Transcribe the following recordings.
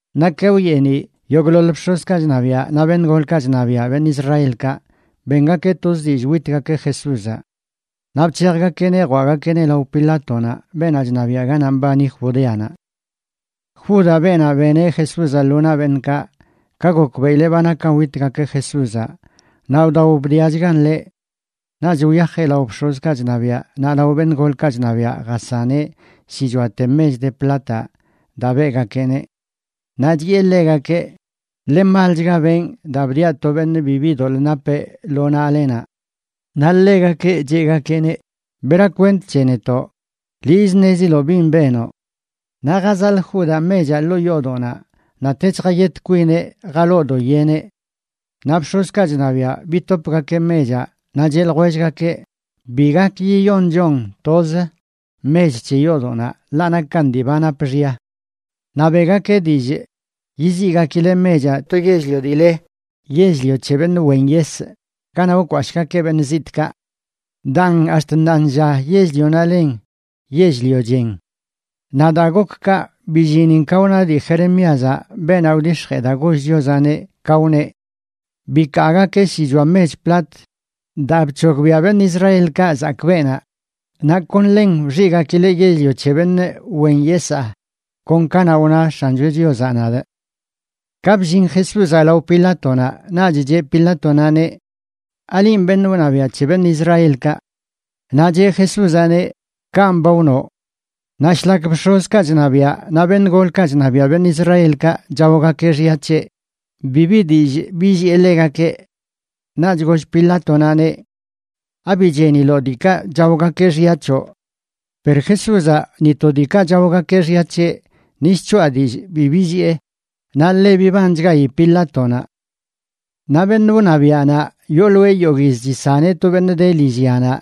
Naꞌ ka wyeeniꞌ, yogꞌḻoḻ bx̱ozkaꞌ chṉabiaꞌ naꞌ beṉꞌ golkaꞌ chṉabiaꞌ beṉꞌ Israelkaꞌ bengakeꞌ toz dillꞌ witgakeꞌ Jesúzaꞌ. Naꞌ bc̱hejgakeꞌneꞌ jwaꞌgakeꞌneꞌ lao Pilátonaꞌ beenaꞌ chṉabiaꞌ ganaꞌ mbani Judeanaꞌ. Judaꞌ, beenaꞌ beneꞌ Jesúzaꞌ lo naꞌ beṉꞌkaꞌ, ka gokbeꞌileꞌ ba nakan witgakeꞌ Jesúzaꞌ naꞌ wdao bdiachgan ḻeꞌ. Naꞌch wyajeꞌ lao bx̱ozkaꞌ chṉabiaꞌ naꞌ lao beṉꞌ golkaꞌ chṉabiaꞌ jasaneꞌ shichoate mech de plataꞌ daa beꞌgakeꞌneꞌ. Naꞌ chiꞌe ḻegakeꞌ: ―Ḻe malchga benꞌ daa bdiaꞌ to beṉꞌ bibi doḻꞌ napeꞌ lo naꞌlenaꞌ. Naꞌ ḻegakeꞌ cheꞌgakeꞌneꞌ: ―¿Bera kwent c̱he netoꞌ? Liꞌz ṉeziloꞌ bin benoꞌ. Naꞌ jazaḻꞌ Judaꞌ mechaꞌ ḻoo yoodoꞌnaꞌ, naꞌ tech jayet kwineꞌ jaloo do yeneꞌ. Naꞌ bx̱ozkaꞌ chṉabiaꞌ bitopgakeꞌ mechaꞌ naꞌ cheꞌ ljwellgakeꞌ: ―Bi gak yiyonchon toz mech c̱he yoodoꞌnaꞌ, ḻaꞌ nakan dii ba nap xya. Naꞌ beꞌgakeꞌ dillꞌ yiziꞌgakileꞌ mechaꞌ to yell-lio dii le Yell-lio c̱he Beṉꞌ Wen Yesꞌ ganaꞌ wkwashꞌgakeꞌ beṉꞌ zitꞌkaꞌ. Daan ax̱t ṉaanlla yell-lionaꞌ len Yell-lio Chen. Naꞌ daa gok kaꞌ, billinin ka wna dii Jeremíazaꞌ, beenaꞌ wdix̱jee daa goll Chiozaꞌneꞌ, ka wneꞌ: “Bikaagakeꞌ shichoa mech plat daa bc̱hogbiaꞌ beṉꞌ Israelkaꞌ zakꞌ beenaꞌ. Naꞌ kon ḻen wxiꞌgakileꞌ Yell-lio c̱he Beṉꞌ Wen Yesaa, kon kanaꞌ wna X̱ancho Chiozaꞌ nadꞌ.” Ka bllin Jesúzaꞌ lao Pilátonaꞌ, naꞌch cheꞌ Pilátonaꞌneꞌ: ―¿Alinꞌ beṉꞌ wṉabiaꞌ c̱he beṉꞌ Israelkaꞌ? Naꞌ cheꞌ Jesúzaꞌneꞌ: ―Kanꞌ ba wnoꞌ. Naꞌ shlak bx̱ozkaꞌ chṉabiaꞌ naꞌ beṉꞌ golkaꞌ chṉabiaꞌ beṉꞌ Israelkaꞌ chaogakeꞌ xya c̱heꞌ, bibi dillꞌ billiꞌe ḻegakeꞌ. Naꞌch goll Pilátonaꞌneꞌ: ―¿Abi cheniloꞌ diikaꞌ chaogakeꞌ xya c̱hoꞌ? Per Jesúzaꞌ ni to diikaꞌ chaogakeꞌ xya c̱heꞌ ni shc̱hoꞌa dillꞌ bi billiꞌe, naꞌ ḻe bibanchgayi Pilátonaꞌ. Naꞌ beṉꞌ wṉabiaꞌnaꞌ yooloeꞌ yogꞌ yiz chisaneꞌ to beṉꞌ de lillyanaꞌ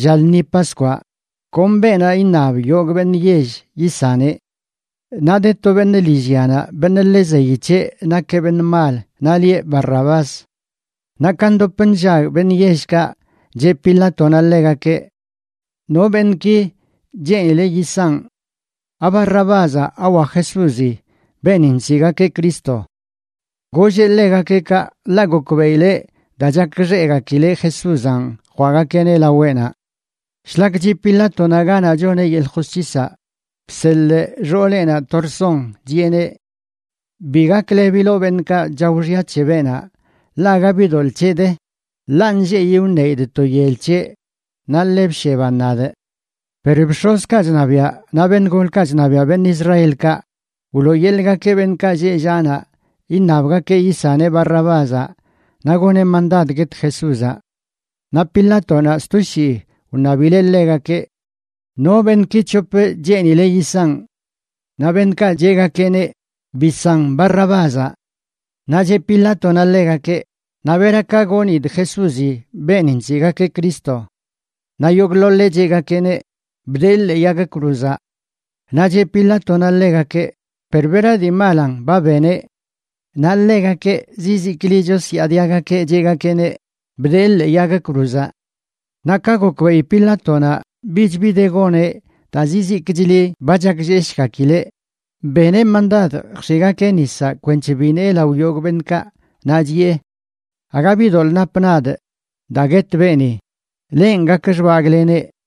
lla lṉi Paskwaꞌ, kon beenaꞌ iṉab yogꞌ beṉꞌ yell yisaneꞌ. Naꞌ de to beṉꞌ lillyanaꞌ, beṉꞌ ḻe zeyi c̱heꞌ nakeꞌ beṉꞌ mal, naꞌ lieꞌ Barrabás. Naꞌ ka ndop nllag beṉꞌ yellkaꞌ, cheꞌ Pilátonaꞌ ḻegakeꞌ: ―¿No beṉꞌki cheenile yisanꞌ?, ¿aBarrabázaꞌ, awa Jesúzi, beeni nsiꞌgakeꞌ Cristo? Golleꞌ ḻegakeꞌ kaꞌ ḻaꞌ gokbeꞌileꞌ daa chakxeꞌgakileꞌ Jesúzanꞌ jwaꞌgakeꞌneꞌ laweꞌnaꞌ. Shlak chiꞌ Pilátonaꞌ ganaꞌ choneꞌ yeḻꞌ josc̱hisaꞌ, bseḻꞌ xooleꞌnaꞌ to rson, chiꞌeneꞌ: “Bi gaklebiloꞌ beṉꞌkaꞌ chao xya c̱he beenaꞌ, ḻaꞌ aga bi doḻꞌ c̱heꞌ de, ḻaꞌ nlleꞌyi wṉeidꞌ to yel c̱heꞌ, naꞌ ḻe bsheban nadꞌ.” Per bx̱ozkaꞌ chṉabiaꞌ naꞌ beṉꞌ golkaꞌ chṉabiaꞌ beṉꞌ Israelkaꞌ wlooyeḻꞌgakeꞌ beṉꞌkaꞌ lleꞌ llaꞌ naꞌ iṉabgakeꞌ yisaneꞌ Barrabázaꞌ naꞌ goneꞌ mandad guet Jesúzaꞌ. Naꞌ Pilátonaꞌ sto shii wṉabileꞌ ḻegakeꞌ: ―¿No beṉꞌki c̱hop cheenile yisanꞌ? Naꞌ beṉꞌkaꞌ cheꞌgakeꞌneꞌ: ―¡Bisan Barrabázaꞌ! Naꞌ cheꞌ Pilátonaꞌ ḻegakeꞌ: ―Naꞌ ¿bera ka gonidꞌ Jesúzi beeni nsiꞌgakeꞌ Cristo? Naꞌ yogꞌḻoḻeꞌ cheꞌgakeꞌneꞌ: ―¡Bdee ḻee yag cruzaꞌ! Naꞌ cheꞌ Pilátonaꞌ ḻegakeꞌ: ―Per ¿bera dii malanꞌ ba beneꞌ? Naꞌ ḻegakeꞌ zizikli chosyaadiagakeꞌ, cheꞌgakeꞌneꞌ: ―¡Bdee ḻee yag cruzaꞌ! Naꞌ ka gokbeꞌi Pilátonaꞌ bich bi de goneꞌ daa zizikchli ba chaklleshgakileꞌ, beneꞌ mandad jx̱iꞌgakeꞌ nisaꞌ kwenc̱he binee lao yogꞌ beṉꞌkaꞌ, naꞌ chiꞌe: ―Aga bi doḻꞌ napꞌ nadꞌ daa guet beeni. Lenꞌ gak xbagꞌleneꞌ.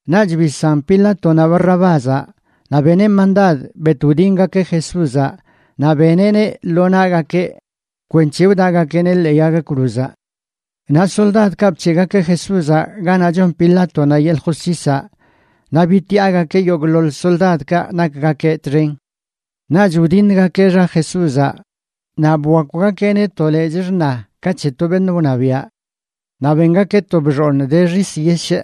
Naꞌch bisan Pilátonaꞌ Barrabázaꞌ, naꞌ beneꞌ mandad bet wdingakeꞌ Jesúzaꞌ naꞌ beneꞌneꞌ lo naꞌgakeꞌ kwenc̱he wdaꞌgakeꞌneꞌ ḻee yag cruzaꞌ. Naꞌ soldadkaꞌ bc̱heꞌgakeꞌ Jesúzaꞌ ganaꞌ chon Pilátonaꞌ yeḻꞌ josc̱hisaꞌ naꞌ bitiꞌagakeꞌ yogꞌḻoḻ soldadkaꞌ nakgakeꞌ txen. Naꞌch wdiṉgakeꞌ xa Jesúzaꞌ naꞌ bwakwgakeꞌneꞌ to lechꞌ xṉa ka c̱he to beṉꞌ wṉabiaꞌ. Naꞌ bengakeꞌ to bxooṉ de xis yeshꞌ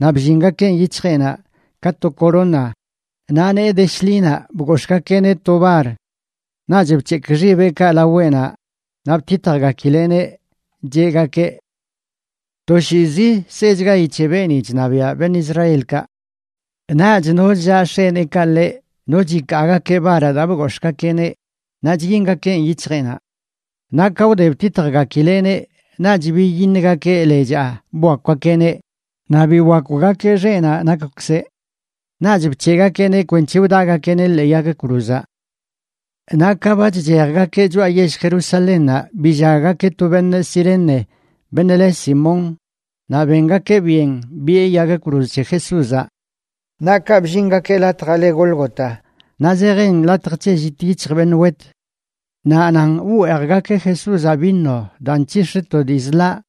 naꞌ bllingakeꞌn yic̱hjeꞌnaꞌ ka to corona, naꞌ nee de shḻinaꞌ bgox̱ꞌgakeꞌneꞌ to bar. Naꞌch bc̱hekꞌ xibeꞌkaꞌ laweꞌnaꞌ naꞌ btitjgakileꞌneꞌ cheꞌgakeꞌ: ―¡Toshiizi sechgayi c̱he beeni chṉabiaꞌ beṉꞌ Israelkaꞌ! Naꞌch no chllaꞌ x̱eneekaꞌ ḻeꞌ, no chikaagakeꞌ baraꞌ daa bgox̱ꞌgakeꞌneꞌ naꞌ chyingakeꞌn yic̱hjeꞌnaꞌ. Naꞌ ka wde btitjgakileꞌneꞌ naꞌch biyiṉgakeꞌ lechaa bwakwgakeꞌneꞌ naꞌ biwakwgakeꞌ xeꞌnaꞌ nakwkzeꞌ. Naꞌch bc̱heꞌgakeꞌneꞌ kwenc̱he wdaꞌgakeꞌneꞌ ḻee yag cruzaꞌ. Naꞌ ka ba chchejgakeꞌ choꞌa yell Jerusalénnaꞌ, billaggakeꞌ to beṉꞌ Cirene, beṉꞌ le Simón, naꞌ bengakeꞌ byen biꞌe yag cruz c̱he Jesúzaꞌ. Naꞌ kaꞌ bllingakeꞌ latjaꞌ le Gólgota, naꞌ zejin Latj c̱he llit yic̱hj beṉꞌ wet. Naꞌ nan wweejgakeꞌ Jesúzaꞌ vino daa nc̱hix̱ꞌ to dii zḻaꞌ,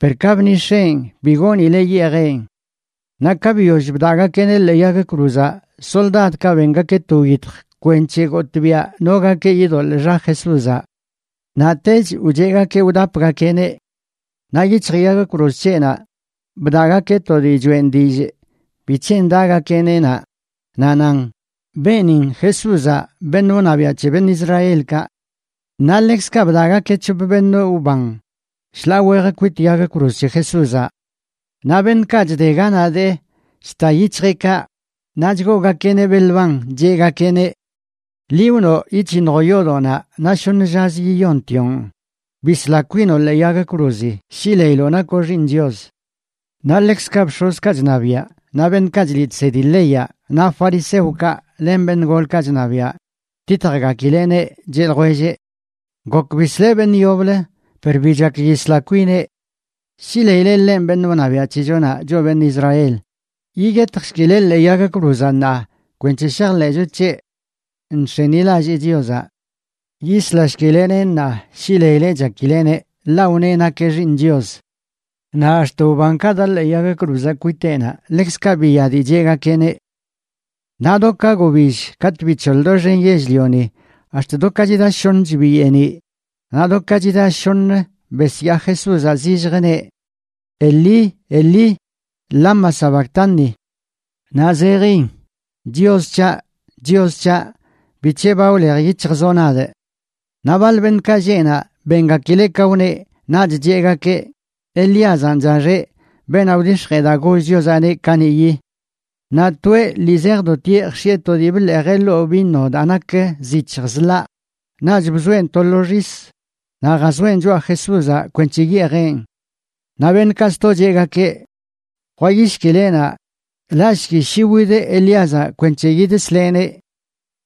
per ka bnix̱eꞌn, bi goonileꞌ yeejeꞌn. Naꞌ ka biyoll bdaꞌgakeꞌneꞌ ḻee yag cruzaꞌ, soldadkaꞌ bengakeꞌ to wyitj kwenc̱he gotꞌbiaꞌ nogakeꞌ yidoḻꞌ xa Jesúzaꞌ. Naꞌtech wcheꞌgakeꞌ wdapgakeꞌneꞌ. Naꞌ yic̱hj yag cruz c̱heꞌnaꞌ bdaꞌgakeꞌ to dii choeꞌn dillꞌ bic̱he ndaꞌgakeꞌneꞌ naꞌ, naꞌ nan: “Beenin Jesúzaꞌ, beṉꞌ wṉabiaꞌ c̱he beṉꞌ Israelkaꞌ.” Naꞌ ḻekzkaꞌ bdaꞌgakeꞌ c̱hop beṉꞌ wban shḻaa wej kwit yag cruz c̱he Jesúzaꞌ. Naꞌ beṉꞌkaꞌ chde ganaꞌ dee, chta yic̱hjeꞌkaꞌ naꞌ chgoogakeꞌneꞌ belban, cheꞌgakeꞌneꞌ: ―Liꞌ wnoꞌ yic̱hiṉjoꞌ yoodoꞌnaꞌ naꞌ shoṉ llazə yiyontioꞌn, ¡bisla kwinoꞌ ḻee yag cruzi shi leiloꞌ nakoꞌ Xiiṉ Chios! Naꞌ ḻekzkaꞌ bx̱ozkaꞌ chṉabiaꞌ naꞌ beṉꞌkaꞌ chliꞌ chsedi leyaꞌ, naꞌ fariseokaꞌ len beṉꞌ golkaꞌ chṉabiaꞌ btitjgakileꞌneꞌ, cheꞌ ljwelleꞌ: ―Gok bisleꞌ beṉꞌ yoblə per bi chak yisla kwineꞌ. Shi leileꞌ ḻenꞌ beṉꞌ wṉabiaꞌ c̱hechonaꞌ, choꞌ beṉꞌ Israel, yiyetjshkileꞌ ḻee yag cruzaꞌ ṉaa kwenc̱he shajḻeꞌcho c̱heꞌ. Nx̱enilallee Chiozaꞌ. Yislashkileꞌneꞌ ṉaa shi leileꞌ chakileꞌneꞌ, ḻaꞌ wneꞌ nakeꞌ Xiiṉ Chios. Naꞌ ax̱t wbankaꞌ daꞌ ḻee yag cruzaꞌ kwiteꞌnaꞌ ḻekzkaꞌ biya dii cheꞌgakeꞌneꞌ. Naꞌ do ka gobill katꞌ bic̱hoḻ doxen yell-lioni ax̱t do ka chida shoṉch biyeeniꞌ. Naꞌ do ka chida shoṉə besyaa Jesúzaꞌ zilljə, neꞌ: ―Elí, Elí, ¿lama sabactani? ―naꞌ zejin: Chios c̱haꞌ, Chios c̱haꞌ, ¿bic̱he ba wlej yic̱hjzoꞌ nadꞌ? Naꞌ baḻ beṉꞌkaꞌ lleꞌ naꞌ, bengakileꞌ ka wneꞌ, naꞌch cheꞌgakeꞌ: ―Elíazanꞌ chaxeꞌ, beenaꞌ wdix̱jee daa goll Chiozaꞌneꞌ kaniꞌyi. Naꞌ toeꞌ lii zejdotieꞌ jx̱iꞌe to dii bḻeejeꞌ ḻoo vino daa nak zic̱hj zḻaꞌ, naꞌch bzoeꞌn to lo xis naꞌ jazoeꞌn choꞌa Jesúzaꞌ kwenc̱he yeejeꞌn. Naꞌ beṉꞌkaꞌ sto cheꞌgakeꞌ: ―Jwayishkileꞌnaꞌ, laꞌshki shi wid Elíazaꞌ kwenc̱he yidsleꞌneꞌ.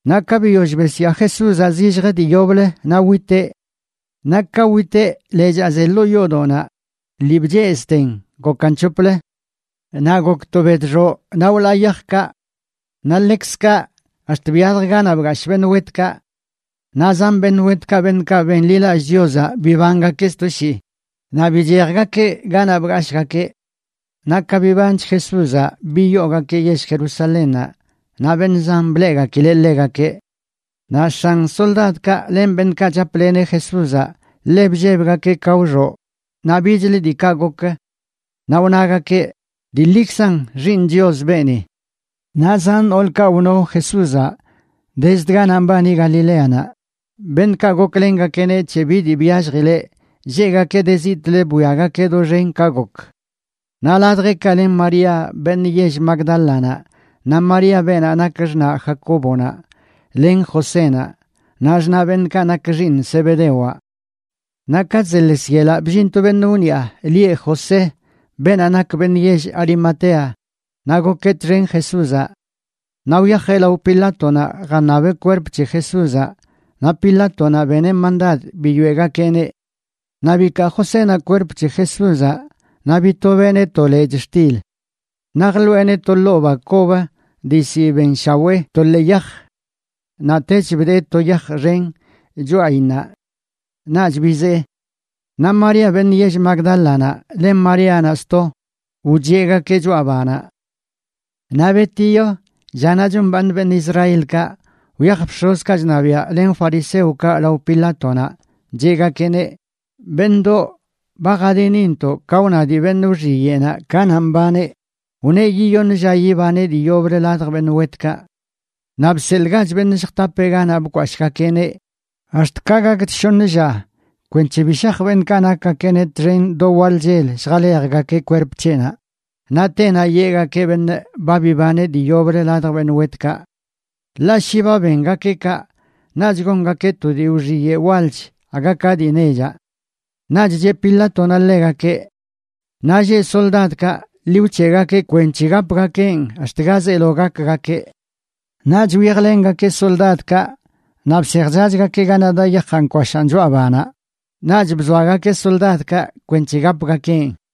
Naꞌ ka biyoll besyaa Jesúzaꞌ zilljə dii yoblə, naꞌ witeꞌ. Naꞌ ka witeꞌ, lechaa ze ḻoo yoodoꞌnaꞌ lii bchezꞌten gokan c̱hoplə. Naꞌ gok to bedxoꞌ naꞌ wlaa yajkaꞌ. Naꞌ ḻekzkaꞌ ax̱t biyalj ganaꞌ bgashꞌ beṉꞌ wetkaꞌ. Naꞌ zan beṉꞌ wetkaꞌ, beṉꞌkaꞌ benḻilallꞌ Chiozaꞌ, bibangakeꞌ sto shii naꞌ bichejgakeꞌ ganaꞌ bgashꞌgakeꞌ. Naꞌ ka bibanch Jesúzaꞌ, biyoogakeꞌ yell Jerusalénnaꞌ, naꞌ beṉꞌ zan bleꞌgakileꞌ ḻegakeꞌ. Naꞌ x̱an soldadkaꞌ len beṉꞌkaꞌ chapleneꞌ Jesúzaꞌ ḻe bllebgakeꞌ ka wxoꞌ naꞌ bichlə diikaꞌ gok. Naꞌ wnagakeꞌ: ―Dii ḻikzan Xiiṉ Chios beeni. Naꞌ zan noolkaꞌ wno Jesúzaꞌ dezd ganaꞌ mbani Galileanaꞌ, beṉꞌkaꞌ goklengakeꞌneꞌ c̱he bi dii byalljileꞌ, lleꞌgakeꞌ de zitꞌlə bwiagakeꞌ doxen ka gok. Naꞌ ladjeꞌkaꞌ len María, beṉꞌ yell Magdálanaꞌ, naꞌ María beenaꞌ nak xṉaꞌ Jacóbonaꞌ len Josénaꞌ, naꞌ xṉaꞌ beṉꞌkaꞌ nak xiiṉ Zebedewaꞌ. Naꞌ ka chzeḻes yelaꞌ bllin to beṉꞌ wniꞌa lieꞌ José, beenaꞌ nak beṉꞌ yell Arimatea naꞌ gokeꞌ txen Jesúzaꞌ. Naꞌ wyajeꞌ lao Pilátonaꞌ jaṉabeꞌ kwerp c̱he Jesúzaꞌ, naꞌ Pilátonaꞌ beneꞌ mandad biyoeꞌgakeꞌneꞌ. Naꞌ bikaa Josénaꞌ kwerp c̱he Jesúzaꞌ naꞌ bitobeꞌneꞌ to lechꞌ xtil. Naꞌ jḻoꞌeneꞌ to ḻoo ba kob dii ziꞌ benshawee to ḻee yaj. Naꞌtech bdee to yaj xen choꞌayinnaꞌ. Naꞌch bizee. Naꞌ María, beṉꞌ yell Magdálanaꞌ, len Maríanaꞌ sto wcheꞌgakeꞌ choꞌa banaꞌ. Naꞌ betiyo, llanaꞌ chombaaṉ beṉꞌ Israelkaꞌ, wyaj bx̱ozkaꞌ chṉabiaꞌ len fariseokaꞌ lao Pilátonaꞌ, cheꞌgakeꞌneꞌ: ―Beṉꞌdoꞌ, ba jadinintoꞌ ka wna dii beṉꞌ wxiyeꞌnaꞌ kanaꞌ mbaneꞌ, wneꞌ yiyoṉ lla yibaneꞌ dii yoblə ladj beṉꞌ wetkaꞌ. Naꞌ bseḻꞌgach beṉꞌ lljtapeꞌ ganaꞌ bkwashꞌgakeꞌneꞌ ax̱t ka gakch shoṉ lla kwenc̱he bi shaj beṉꞌkaꞌ nakgakeꞌneꞌ txen do waḻ chel lljalejgakeꞌ kwerp c̱heꞌnaꞌ, naꞌ tenaꞌ yeꞌgakeꞌ beṉꞌ: “Ba bibaneꞌ dii yoblə ladj beṉꞌ wetkaꞌ.” Ḻaꞌ shi ba bengakeꞌ kaꞌ, naꞌch gongakeꞌ to dii wxiyeꞌ walch aga ka dii nechaꞌ. Naꞌch cheꞌ Pilátonaꞌ ḻegakeꞌ: ―Naꞌ lleꞌ soldadkaꞌ, ḻi wc̱heꞌgakeꞌ kwenc̱he gapgakeꞌn ax̱t ga zeelo gakgakeꞌ. Naꞌch wyajlengakeꞌ soldadkaꞌ naꞌ bsejchachgakeꞌ ganaꞌ daꞌ yajaꞌ nkwashaꞌn choꞌa banaꞌ. Naꞌch bzoagakeꞌ soldadkaꞌ kwenc̱he gapgakeꞌn.